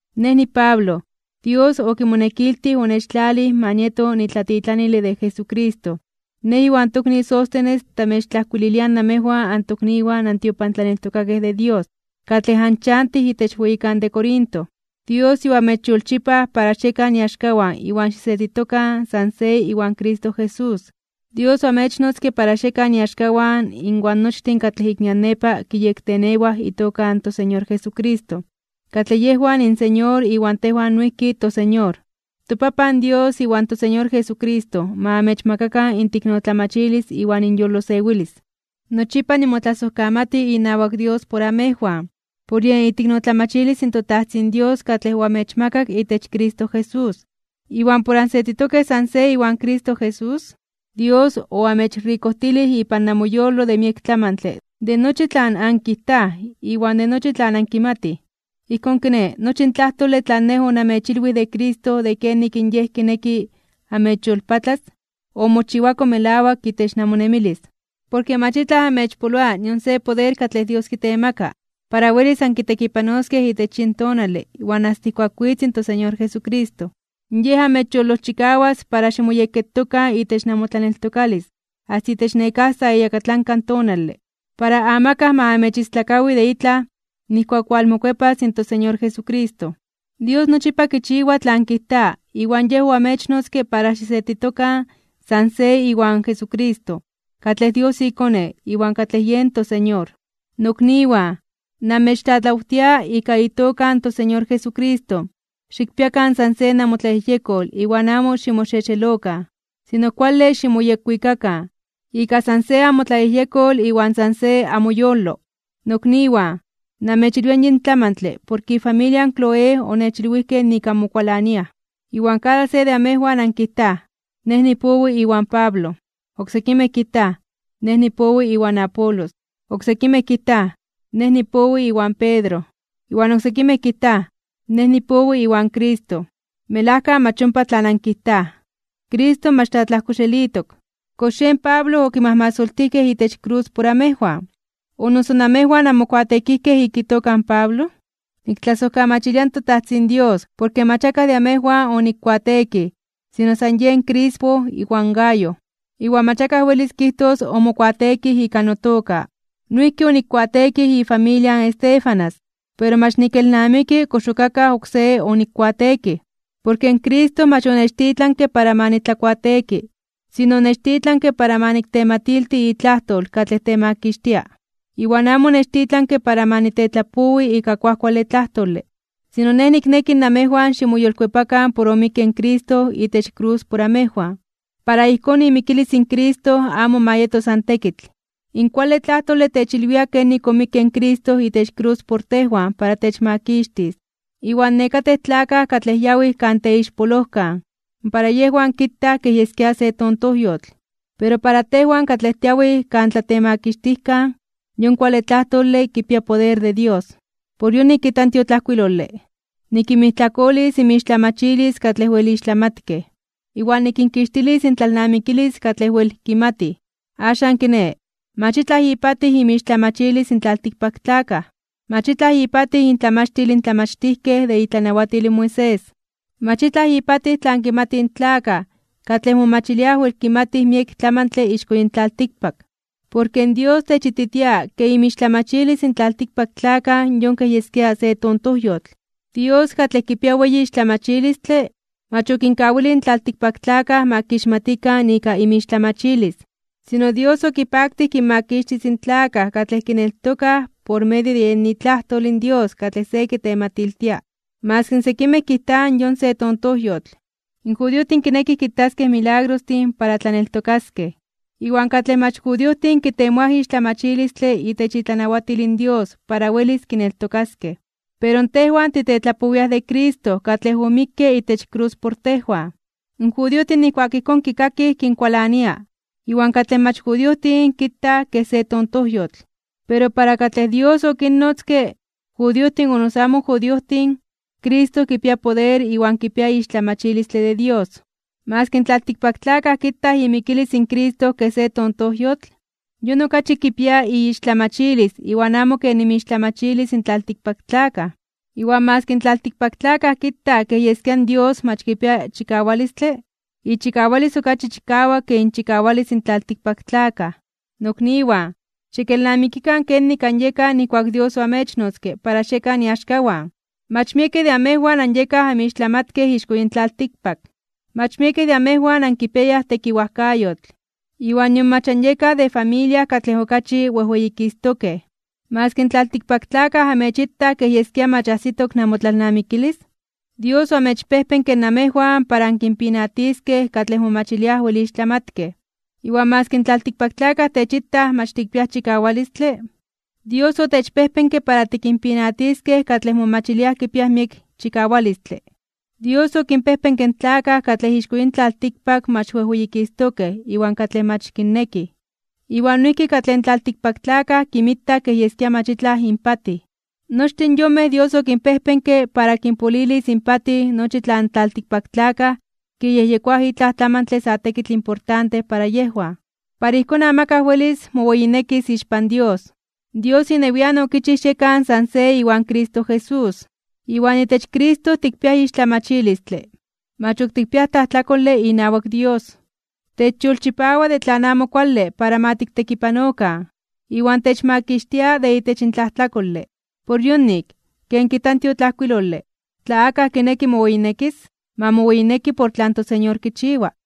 Nej niPablo, Dios okimonekiltij onechtlalij ma nieto nitlatitlanile de Jesucristo. Nej iwan tokni Sóstenes tamechtlajkuililiaj namejwan antokniwan antiopantlaneltokakej de Dios, katlej anchantij itech weyikan de Corinto. Dios yoamechyolchipaj para xiekan iaxkawan iwan xisetitokan san se iwan Cristo Jesús. Dios oamechnotzke para xiekan iaxkawan inwan nochtin katlej ik nian nepa kiyektenewaj itoka in toSeñor Jesucristo, katlej yejwan inSeñor iwan tejwan noijki toSeñor. ToPapan Dios iwan toSeñor Jesucristo ma amechmakakan inteiknotlamachilis iwan inyolosewilis. Nochipa nimotlasojkamati inawak Dios por amejwan, por yen iteiknotlamachilis in toTajtzin Dios katlej oamechmakak itech Cristo Jesús. Iwan por ansetitokej san se iwan Cristo Jesús, Dios oamechrikojtilij ipan namoyolo de miek tlamantle, de nochi tlan ankijtaj iwan de nochi tlan ankimatij. Ijkón kiné, nochi in tlajtole tlan nej onamechilwij de Cristo de kenik in Yej kineki amechyolpatlas, omochiwako melawak itech namonemilis. Porke mach itlaj amechpoloa nion se poder katlej Dios kitemaka para welis ankitekipanoskej itech yin tonale iwan asta ijkuak witz in toSeñor Jesucristo. Yej amechyolojchikawas para ximoyekketokan itech namotlaneltokalis asta itech nekáj sa iyakatlanka tonale, para amakaj ma amechistlakawi de itlaj nijkuak walmokuepas in toSeñor Jesucristo. Dios nochipa kichiwa tlan kijta, iwan Yej oamechnotzke para xisetitokan san se iwan Jesucristo, katlej Dios iKone, iwan katlej yen toSeñor. Nokniwan, namechtlatlawtia ika itoka in toSeñor Jesucristo, xikpiakan san se namotlayejyekol iwan amo ximoxexelokan. Sino kuale ximoyekwikakan, ika san se amotlayejyekol iwan san se amoyolo. Nokniwan, namechilwia yin tlamantle porke ifamilia in Cloé onechilwijkej nik anmokualaniaj. Iwan kada se de amejwan ankijtaj: “Nej nipowi iwan Pablo”, oksekimej kijtaj: “Nej nipowi iwan Apolos”, oksekimej kijtaj: “Nej nipowi iwan Pedro”, iwan oksekimej kijta: “Nej nipowi iwan Cristo.” Melajka mach ompa tlan ankijtaj. Cristo mach tlatlajkoxelitok. ¿Kox yen Pablo okimajmasoltijkej itech krus por amejwan? ¿O noso namejwan anmokuateekijkej ika itoka in Pablo? Niktlasojkamachilia in toTajtzin Dios porke mach akaj de amejwan onikkuateekij sino san yen Crispo iwan Gayo. Iwan mach akaj welis kijtos omokuateekij ika notoka. Noijki onikkuateekij ifamilia in Estéfanas, pero mach nikelnamiki kox ok akaj oksé onikkuateekij. Porke Cristo mach onechtitlanke para ma nitlakuateeki, sino onechtitlanke para ma niktematilti itlajtol katlej temakixtia. Iwan amo onechtitlanke para ma nitetlapowi ika kuajkuale tlajtole. Sino nej nikneki namejwan ximoyolkuepakan por omikke in Cristo itech krus por amejwan, para ijkón imikilis in Cristo amo ma yeto san tekitl. In kuale tlajtole techilwia kenik omikke in Cristo itech krus por tejwan para techmakixtis. Iwan nekatej tlakaj katlej yawij kan teixpolojkan, para yejwan kitaj kej yeskia se tontojyotl. Pero para tejwan katlej tiawij kan tlatemakixtijkan, yon kuale tlajtole kipia poder de Dios. Por yonik kijta in tiotlajkuilole: Nikinmijtlakolis inmixtlamachilis katlej wel ixtlamatkej. Iwan nikinkixtilis intlalnamikilis katlej wel kimatij. Axan kiné, mach itlaj ipatij inmixtlamachilis in tlaltikpaktlakaj. Mach itlaj ipatij intlamachtil in tlamachtijkej de itlanawatil in Moisés. Mach itlaj ipatij tlan kimatij in tlakaj katlej momachiliaj wel kimatij miek tlamantle ixko yin tlaltikpak. Porke Dios techititia ke inmixtlamachilis in tlaltikpaktlakaj yon kej yeskia se tontojyotl. Dios katlej kipia weyi ixtlamachilistle, mach okinkawilij in tlaltikpaktlakaj ma kixmatikan ika inmixtlamachilis. Sino Dios okipaktij kinmakixtis in tlakaj katlej kineltokaj por medio de yen itlajtol in Dios katlej se kitematiltia, maski sekimej kijtaj yon se tontojyotl. In judiojtin kinekij kitaskej milagrostin para tlaneltokaskej, iwan katlej mach judiojtin kitemoaj ixtlamachilistle itech itlanawatil in Dios para welis kineltokaskej. Pero tejwan titetlapowiaj de Cristo katlej omikke itech krus por tejwan. In judiojtin nijkuak ijkón kikakij kinkualania, iwan katlej mach judiojtin kitaj kej se tontojyotl. Pero para katlej Dios okinnotzke, judiojtin o noso amo judiojtin, Cristo kipia poder iwan kipia ixtlamachilistle de Dios. Maski in tlaltikpaktlakaj kitaj imikilis in Cristo kej se tontojyotl, yon okachi kipia iixtlamachilis iwan amo ken inmixtlamachilis in tlaltikpaktlakaj. Iwan maski in tlaltikpaktlakaj kitaj kej yeskia in Dios mach kipia chikawalistle, ichikawalis okachi chikawak ke inchikawalis in tlaltikpaktlakaj. Nokniwan, xikelnamikikan kenik anyekaj nijkuak Dios oamechnotzke para xiekan iaxkawan. Mach miekej de amejwan anyekaj anmixtlamatkej ixko yin tlaltikpak. Mach miekej de amejwan ankipiayaj tekiwajkayotl, iwan nion mach anyekaj de familia katlej okachi wejweyikistokej (wejweyititokej). Maski in tlaltikpaktlakaj amechitaj kej yeskia mach ajsitok namotlalnamikilis, Dios oamechpejpenke namejwan para ankinpinatiskej katlej momachilia wel ixtlamatkej. Iwan maski in tlaltikpaktlakaj techitaj mach tikpiaj chikawalistle, Dios otechpejpenke para tikinpinatiskej katlej momachiliaj kipiaj miek chikawalistle. Dios okinpejpenke in tlakaj katlej ixko yin tlaltikpak mach wejweyikistokej (wejweyititokej) iwan katlej mach kinnekij, iwan noijki katlej in tlaltikpaktlakaj kinmitaj kej yeskia mach itlaj inpatij. Nochtin yonmej Dios okinpejpenke para kinpolilis inpatij nochi tlan in tlaltikpaktlakaj kiyejyekoaj itlaj tlamantle sa tekitl importante para yejwan. Para ijkón amakaj welis moweyinekis ixpan Dios. Dios inewian okichij xiekan san se iwan Cristo Jesús. Iwan itech Cristo tikpiaj ixtlamachilistle, mach ok tikpiaj tlajtlakole inawak Dios, techyolchipawa de tlan amo kuale para ma tiktekipanokan, iwan techmakixtia de itech tlajtlakole. Por yonik, ken kijta in tiotlajkuilole: “Tla akaj kineki moweyinekis, ma moweyineki por tlan toSeñor kichiwa.”